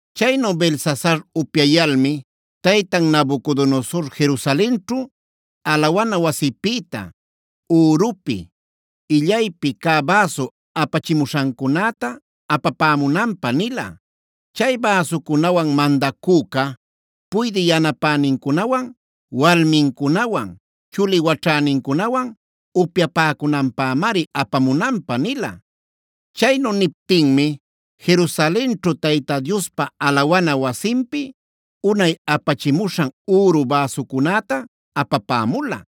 Chaynu Belsasar upyayalmi taytan Nabucodonosor Jerusalenćhu alawana wasipïta ürupi, illaypi cä bäsu apachimuśhancunäta apapämunanpä nila. Chay bäsucunawan mandacüca puydï yanapänincunawan, walmincunawan, chuli waćhänincunawan upyapäcunanpämari apamunanpä nila. Chaynu niptinmi Jerusalenćhu Tayta Diospa alawana wasinpi unay apachimuśhan üru bäsucunäta apapämula.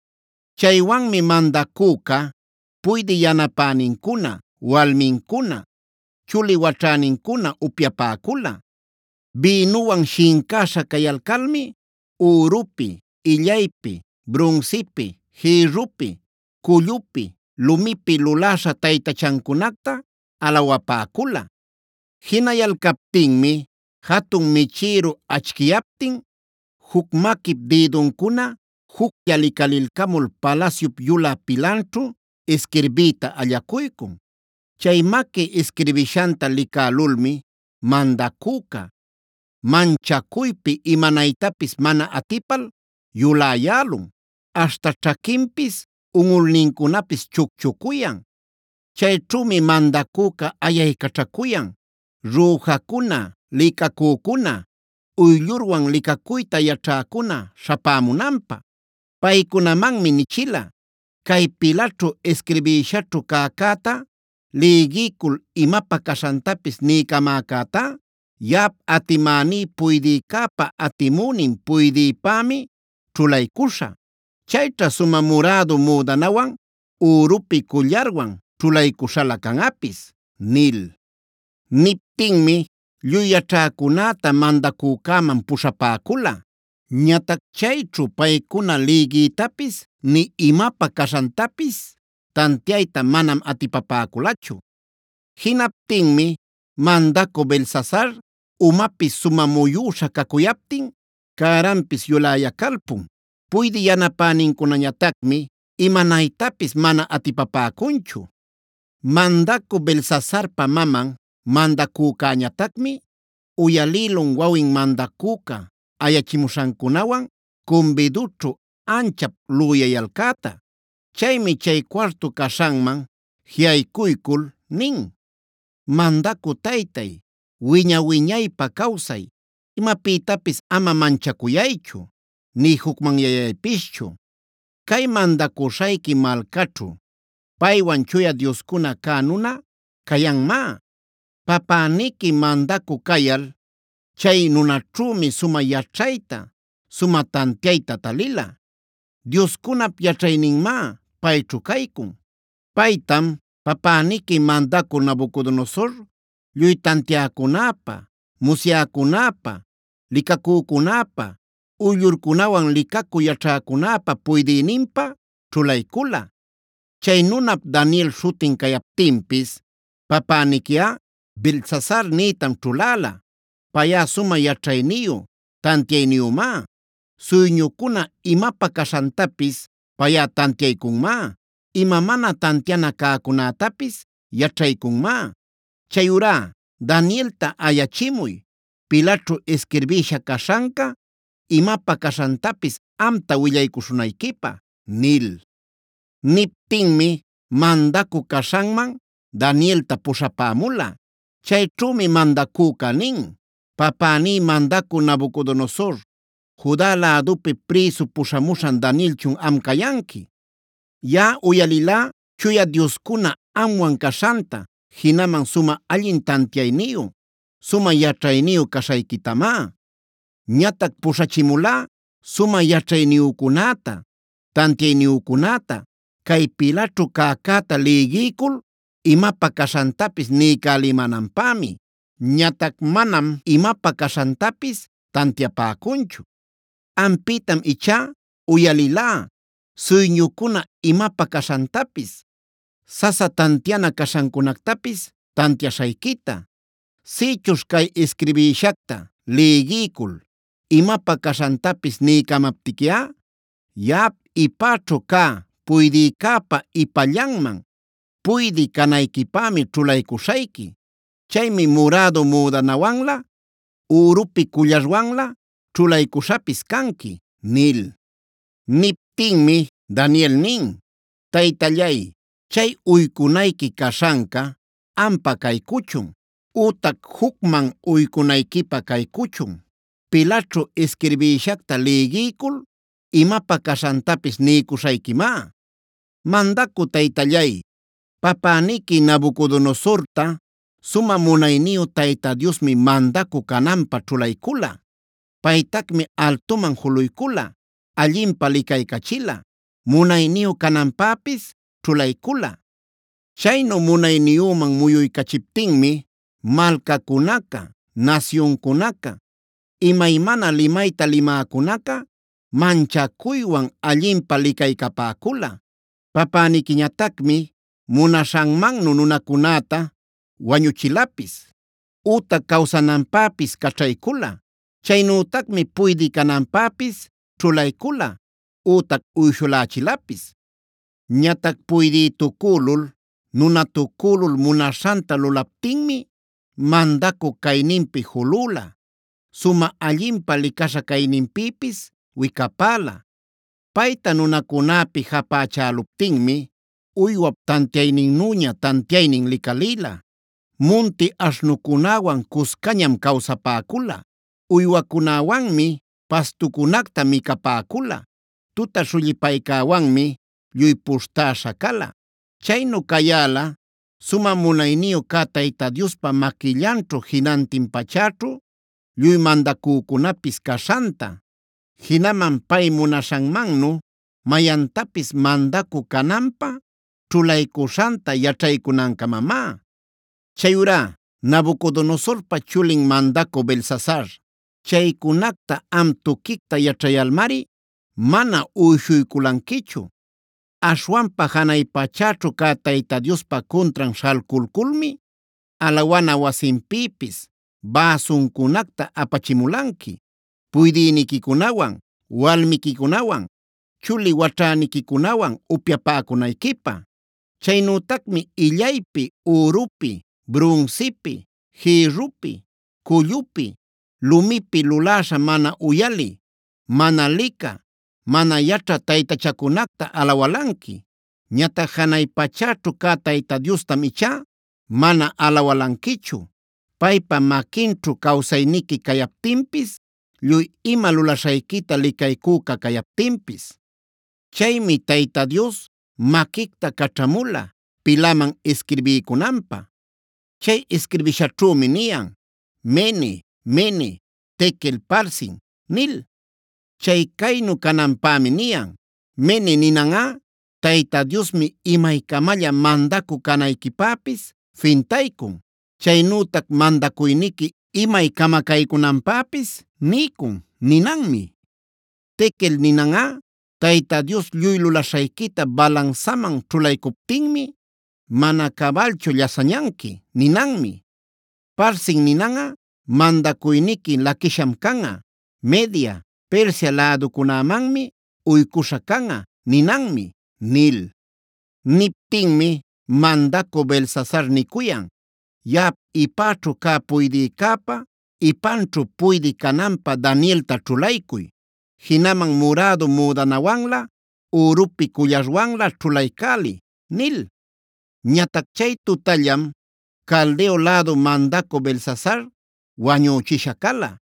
Chaywanmi mandacüca, puydï yanapänincuna, walmincuna, chuli waćhänincunawan upyapäcula. Bïnuwan shincäśha cayalcalmi ürupi, illaypi, brunsipi, jïrrupi, cullupi, lumipi luläśha taytachancunacta alawapäcula. Jinayalcaptinmi jatun michïru achquiyaptin juc maquip dïduncuna juclla licalilcamul palasyup yulä pilanćhu isquirbiyta allacuycun. Chay maqui isquirbishanta licälulmi mandacüca, manchacuypi imanaytapis mana atipal yuläyälun aśhta ćhaquinpis, unꞌulnincunapis chucchucuyan. Chayćhümi mandacüca ayaycaćhacuyan rüjacuna, licacücuna, uyllurwan licacuyta yaćhäcuna śhapämunanpä. Paycunamanmi nichila: “Cay pilaćhu isquirbïshaćhu cäcäta lïgiycul imapä caśhantapis niycamäcätá, yaꞌap atimäní puydïcäpa atimünin puydïpämi ćhulaycuśhä. Chayćha sumä murädu müdanawan,b ürupi cullarwan ćhulaycuśhalä canꞌapis” nil. Niptinmi lluy yaćhäcunäta mandacücäman puśhapäcula. Ñatac chayćhu paycuna lïgiytapis nï imapä caśhantapis tantiayta manam atipapäculachu. Jinaptinmi mandacü Belsasar umapis sumä muyüśha cacuyaptin cäranpis yuläyacalpun. Puydï yanapänincunañatacmi imanaytapis mana atipapäcunchu. Mandacü Belsasarpa maman mandacücäñatacmi uyalïlun wawin mandacüca ayachimuśhancunawan cumbidućhu anchap lüyayalcäta. Chaymi chay cuartu caśhanman jiꞌaycuycul nin: “¡Mandacü taytay, wiña-wiñaypä cawsay! Imapïtapis ama manchacuyaychu nï jucmanyayaypischu. Cay mandacuśhayqui malcaćhu paywan chuya dioscuna cä nuna cayanmá. Papäniqui mandacü cayal chay nunaćhümi sumä yaćhayta, sumä tantiayta talila; dioscunap yaćhayninmá payćhu caycun. Paytam, papäniqui mandacü Nabucodonosor lluy tantiäcunäpa, musyäcunäpa, licacücunäpa, uyllurcunawan licacü yaćhäcunäpa puydïninpä ćhulaycula. Chay nunap Daniel śhutin cayaptinpis papäniquiꞌa Beltsasar nïtam ćhuläla. Payꞌa sumä yaćhayniyu, tantiayniyümá; suyñucuna imapä caśhantapis payꞌa tantiaycunmá; ima mana tantiana cäcunätapis yaćhaycunmá. Chayurá Danielta ayachimuy pilaćhu isquirbïsha caśhanca imapä caśhantapis amta willaycuśhunayquipä” nil. Niptinmi mandacü caśhanman Danielta puśhapämula. Chayćhümi mandacüca nin: “¿Papäní mandacü Nabucodonosor, Juda lädupi prïsu puśhamuśhan Danielchun am cayanqui? Yaꞌa uyalilá chuya dioscuna amwan caśhanta jinaman sumä allin tantiayniyu, sumä yaćhayniyu caśhayquitamá. Ñatac puśhachimulá sumä yaćhayniyücunäta, tantiayniyücunäta cay pilaćhu cäcäta lïgiycul imapä caśhantapis niycälimänanpämi. Ñatac manam imapä caśhantapis tantiapäcunchu. Ampïtam ichá uyalilá suyñucuna imapä caśhantapis, sasa tantiana caśhancunactapis tantiaśhayquita. Sïchuśh cay isquirbïshacta lïgiycul imapä caśhantapis niycamaptiquiꞌa yaꞌap ipäćhu cä puydïcäpa ipallanman puydï canayquipämi ćhulaycuśhayqui. Chaymi murädu müdananwanlä, ürupi cullarwanlä ćhulaycuśhapis canqui” nil. Niptinmi Daniel nin: “Taytallay, chay uycunayqui caśhanca ampa caycuchun ütac jucman uycunayquipä caycuchun. Pilaćhu isquirbïshacta lïgiycul imapä caśhantapis niycuśhayquimá. “Mandacü taytallay, papäniqui Nabucodonosorta sumä munayniyu Tayta Diosmi mandacü cananpä ćhulaycula. Paytacmi altuman juluycula, allinpä licaycachila, munayniyu cananpäpis ćhulaycula. Chaynu munayniyüman muyuycachiptinmi malcacunaca, nasyuncunaca, imaymana limayta limäcunaca manchacuywan allinpä licaycapäcula. Papäniquiñatacmi munaśhanmannu nunacunäta wañuchilapis ütac cawsananpäpis caćhaycula. Chaynütacmi puydï cananpäpis ćhulaycula ütac uyshulächilapis. Ñatac puydïtucülul, nunatucülul munaśhanta lulaptinmi mandacü cayninpi julüla; sumä allinpä licaśha cayninpïpis wicapäla. Payta nunacunäpi japächäluptinmi uywap tantiayninnüña tantiaynin licalïla. Munti aśhnucunäwan cuscañam cawsapäcula. Uywacunäwanmi pastucunacta micapäcula. Tuta śhullipaycäwanmi lluy puśhtäśha cala. Chaynu cayäla sumä munayniyu cä Tayta Diospa maquillanćhu jinantin pachäćhu lluy mandacücunapis caśhanta, jinaman pay munaśhanmannu mayantapis mandacü cananpä ćhulaycuśhanta yaćhaycunancamamá. “Chayurá Nabucodonosorpa chulin mandacü Belsasar, chaycunacta am tuquicta yaćhayalmari mana uyshuyculanquichu. Aśhwanpa janay pachäćhu cä Tayta Diospa cuntran śhalculculmi alawana wasinpïpis bäsuncunacta apachimulanqui puydïniquicunawan, walmiquicunawan, chuli waćhäniquicunawan upyapäcunayquipä. Chaynütacmi illaypi, ürupi, brunsipi, jïrrupi, cullupi, lumipi luläśha mana uyalï, mana licä, mana yaćhä taytachacunacta alawalanqui. Ñatac janay pachäćhu cä Tayta Diostam ichá mana alawalanquichu, paypa maquinćhu cawsayniqui cayaptinpis, lluy ima lulaśhayquita licaycüca cayaptinpis. “Chaymi Tayta Dios maquicta caćhamula pilaman isquirbiycunanpä. Chay isquirbishaćhümi niyan: ‘MENE, MENE, TEKEL, PARSIN’ nil. Chay caynu cananpämi niyan: MENE ninanꞌa: ‘Tayta Diosmi imaycamalla mandacü canayquipäpis fintaycun; chaynütac mandacuyniqui imay camacaycunanpäpis niycun’ ninanmi. TEKEL ninanꞌa: ‘Tayta Dios, lluy lulaśhayquita balansaman ćhulaycuptinmi mana cabalchu llasañanqui’ ninanmi. PARSIN ninanꞌa: ‘Mandacuyniqui laquiśham canꞌa; Media, Persia läducunämanmi uycuśha canꞌa’ ninanmi” nil. Niptinmi mandacü Belsasar nicuyan: “Yaꞌap ipäćhu cä puydïcäpa, ipanćhu puydï cananpä Danielta ćhulaycuy. Jinaman murädu müdananwanlä, ürupi cullarwanlä ćhulaycäliy” nil. Ñatac chay tutallam Caldeo lädu mandacü Belsasar wañüchisha cala.